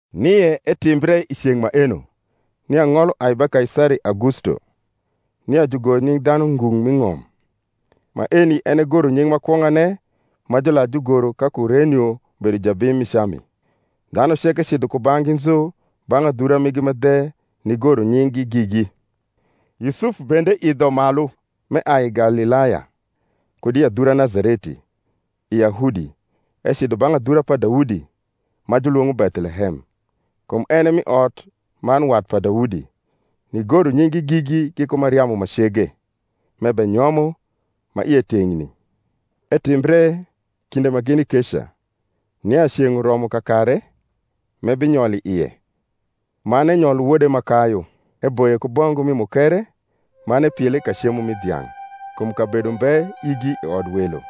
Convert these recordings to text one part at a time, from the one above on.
Nie etimbre i ceng’ maeno, nia ng’ol uai ba Kaisari Augusto, nia jugor nying’ dhanu ngung’ m’i ng’om. Maeni en e goronying’ ma kwong’ane ma jular jugoro ka Kurenio bedo jabim mi Cami. Dhanu ceke cidho kubang’gi nzu bang’ adhura migi ma dhe nigoro nying’gi gigi. Yusuf bende idho malu m’eai i Galilaya, kud i adhura Nazareti, i Yahudi, ecidho bang’ adhura pa Daudi, ma julwong’o Bethlehem, kum en e mi ot man wat pa Daudi; nigoro nying’gi gigi giku Mariamu ma cege, m’ebenyomo, ma ie teng’ni. Etimbre, kinde ma gini keca, nia ceng’ uromo kakare m’ebinyol i ie. Man enyolo wode ma kayu; eboye ku bongu mi mukere, man epiele i ka cemo mi dhiang’, kum kabedo mbe igi i odwelo.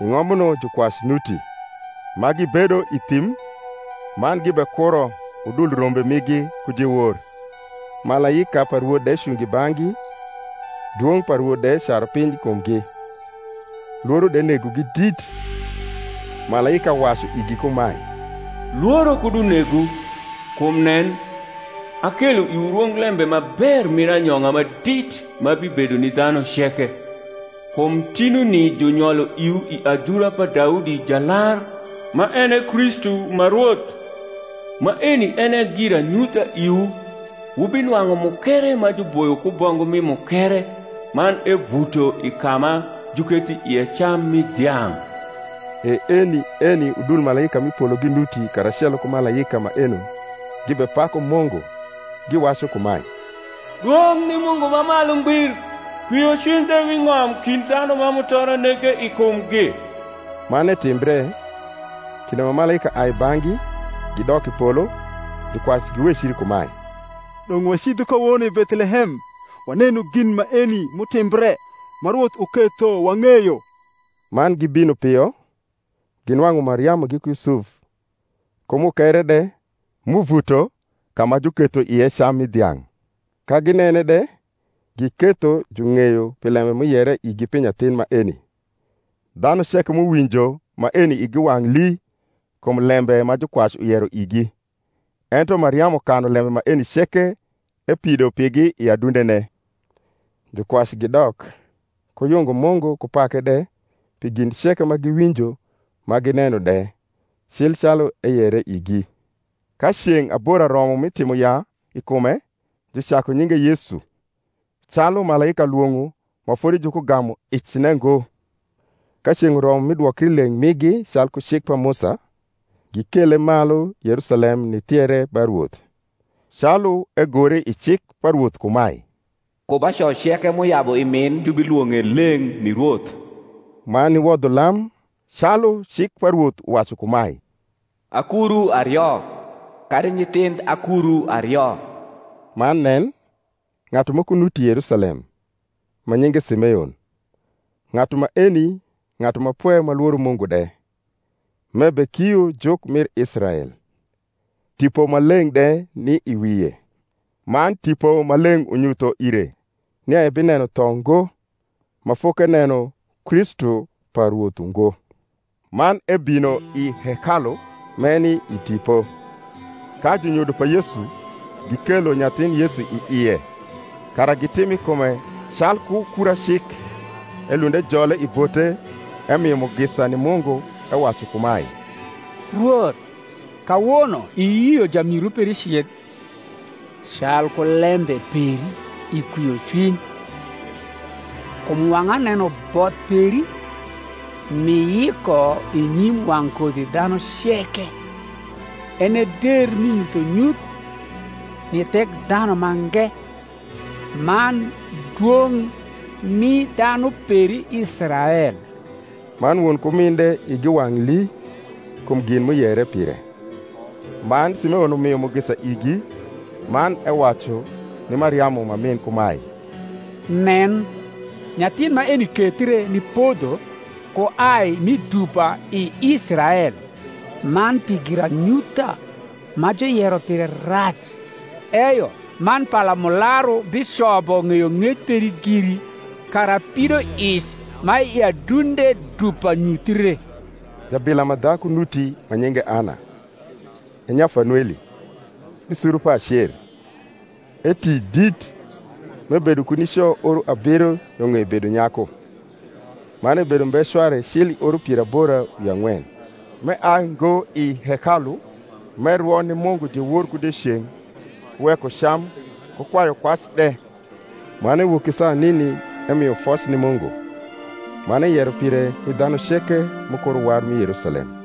I ng’ombuno jukwac nuti, ma gibedo i thim, man gibekuro udul rombe migi ku diewor. Malaika pa Rwoth de cungo i bang’gi dwong’ pa Rwoth de caru piny i kumgi: Iworo de negogi dit. Malaika wacu igi kumae, Lworo kud unegwu; kum nen, akelo iwu rwonglembe ma ber mir anyong’a ma dit ma bibedo ni dhanu ceke: kum tinuni junyolo iwu i adhura pa Daudi Jalar, ma en e Kristu ma Rwoth. Maeni en e giranyutha iwu: Wubinwang’u mukere ma juboyo ku bongu mi mukere, man evuto i ka ma juketho ie cam mi dhiang’. E eni eni udul malaika m’i polo ginuti karacelo ku malaika maeno gibepaku Mungu, giwacu kumae, Dwong’ ni Mungu ma malu ngbir, Kwiocwiny de wi ng’om kind dhanu ma mutoro nege i kumgi. Man etimbre, kinde ma malaika ai i bang’gi gidok i polo, jukwac giwecri kumae, Dong’ wacidhu kawono i Bethiehem, wanenu gin maeni m’utimbre, ma Rwoth uketho wang’eyo. Man gibino pio, ginwang’u Mariamu giku Yusuf, ku mukere de m’uvuto ka ma juketho ie cam mi dhiang’. Ka ginene de, giketho jung’eyo pi lembe m’uyere igi pi nyathin maeni. Dhanu ceke m’uwinjo maeni igi wang’ lii kum lembe ma jukwac uyero igi. Ento Mariamu kanu lembe maeni ceke, epido pigi i adundene. Jukwac gidok, ku yungo Mungu ku pake de pi gin ceke ma giwinjo ma gineno de, cil calu eyere igi. Ka ceng’ abora romo mi timo yaa i kume, jucaku nyinge Yesu, calu malaika lwong’o ma fodi jukugamu icne ngo. Ka ceng’ uromo mi dwokri leng migi calku cik pa Musa, gikele malu Yerusalem nithiere ba Rwoth (calu egore i cik pa Rwoth kumae, Ku ba co ceke m’uyabu i min jubilwong’e leng’ ni Rwoth), man niwodho lam calu cik pa Rwoth uwacu kumae, Akuru ario, kadi nyithindh akuru ario. Man nen, ng’atu moko nuti Yerusalem, ma nyinge Simeon; ng’atu maeni ng’atu ma pwe ma lworo Mungu de, m’ebekio juk mir Israel: Tipo Maleng’ de ni i wie. Man Tipo Maleng’ unyutho ire nia ebineno tho ngo, ma fokeneno Kristu pa Rwoth ungo. Man ebino i hekalu m’eni i Tipo: ka junyodo pa Yesu gikelo nyathin Yesu i ie, kara gitim i kume calku kura cik, elund ejole i bote, emio mugisa ni Mungu, ewacu kumae, Rwoth, kawono iyio jamiru peri cidh, Calku lembe peri, i kwiocwiny; Kum wang’a neno both peri, M’iyiko i nyim wang’ kodhidhanu ceke; En e der mi nyuthonyuth ni Thekdha numange, Man dwong’ mi dhanu peri Israel. Man won ku min de igi wang’ lii kum gin m’uyere pire; man Simeon umio mugisa igi, man ewacu ni Mariamu ma min kumae, Nen, nyathin maeni kethre ni podho ku ai mi dupa i Israel; man pi giranyutha ma juyero pire rac: eyo man palamularu bicobo ng’eyong’ec peri giri; kara pidoic ma i adunde dupa nyuthie. Jabila ma dhaku nuti ma nyinge Ana, e nya Fanueli, mi suru pa Acer (eti dit, m’ebedo ku nico oro abiro yo ng’ei bedo nyaku, man ebedo umbe cware cil i oro pier abora wi ang’wen), m’eai ngo i hekalu, m’erwo ni Mungu diewor ku dieceng’ ku weko cam ku kwayukwac de. Man ewok i saa nini emio foc ni Mungu, man eyero pire ni dhanu ceke m’ukuro war mi Yerusalem.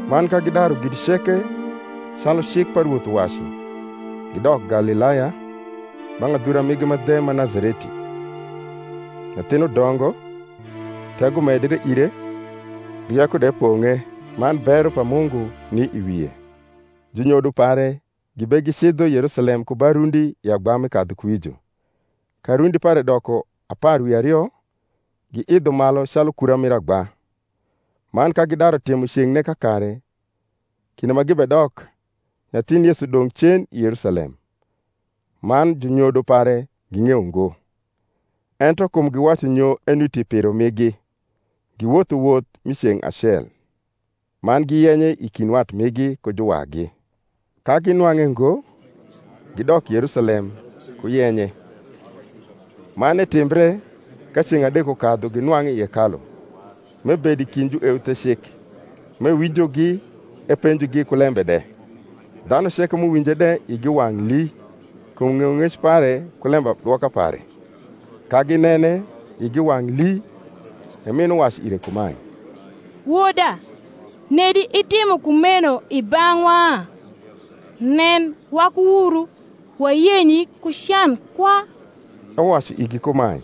Man ka gidaru gin ceke calu cik pa Rwoth uwacu, gidok Galilaya, bang’ adhura migi ma dhe ma Nazareti. Nyathin udongo, tego medre ire, rieko de pong’e: man bero pa Mungu ni i wie. Junyodo pare gibegicidho Yerusalem ku ba rundi i agba mi kadhukuwijo. Ka rundi pare doko apar wi ario, giidho malu calu kura mir agba; man ka gidaru timo ceng’ne kakare, kinde ma gibedok, nyathin Yesu dong’ cen i Yerusalem; man junyodo pare ging’eyo ngo; ento kum giwacu nyo enuti i piro migi, giwotho woth mi ceng’ acel; man giyenye i kind wat migi ku juwagi; ka ginwang’e ngo, gidok Yerusalem, ku yenye. Man etimbre, ka ceng’ adek ukadhu ginwang’e i hekalu, m’ebedo i kind jueuthecik, m’ewinjogi epenjogi ku lembe de: dhanu ceke m’uwinje de igi wang’ lii kum ng’eyong’ec pare ku lembadwoka pare. Ka ginene, igi wang’ lii; e min uwacu ire kumae, Woda, nedi itimo kumeno i bang’wa? nen, waku wuru wayenyi ku can kwa. Ewacu igi kumae,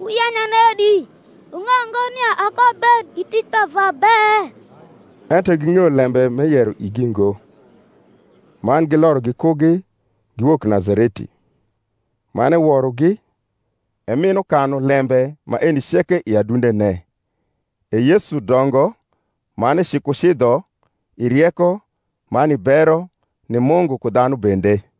Wuyenya nedi? wung’eyo ngo nia akoabed i tic pa Vwa be? Ento ging’eyo lembe m’eyero igi ngo. Man giloro gikugi, giwok Nazareti; man eworogi: e min ukanu lembe maeni ceke i adundene. E Yesu dongo man ecikucidho i rieko, man i bero ni Mungu ku dhanu bende.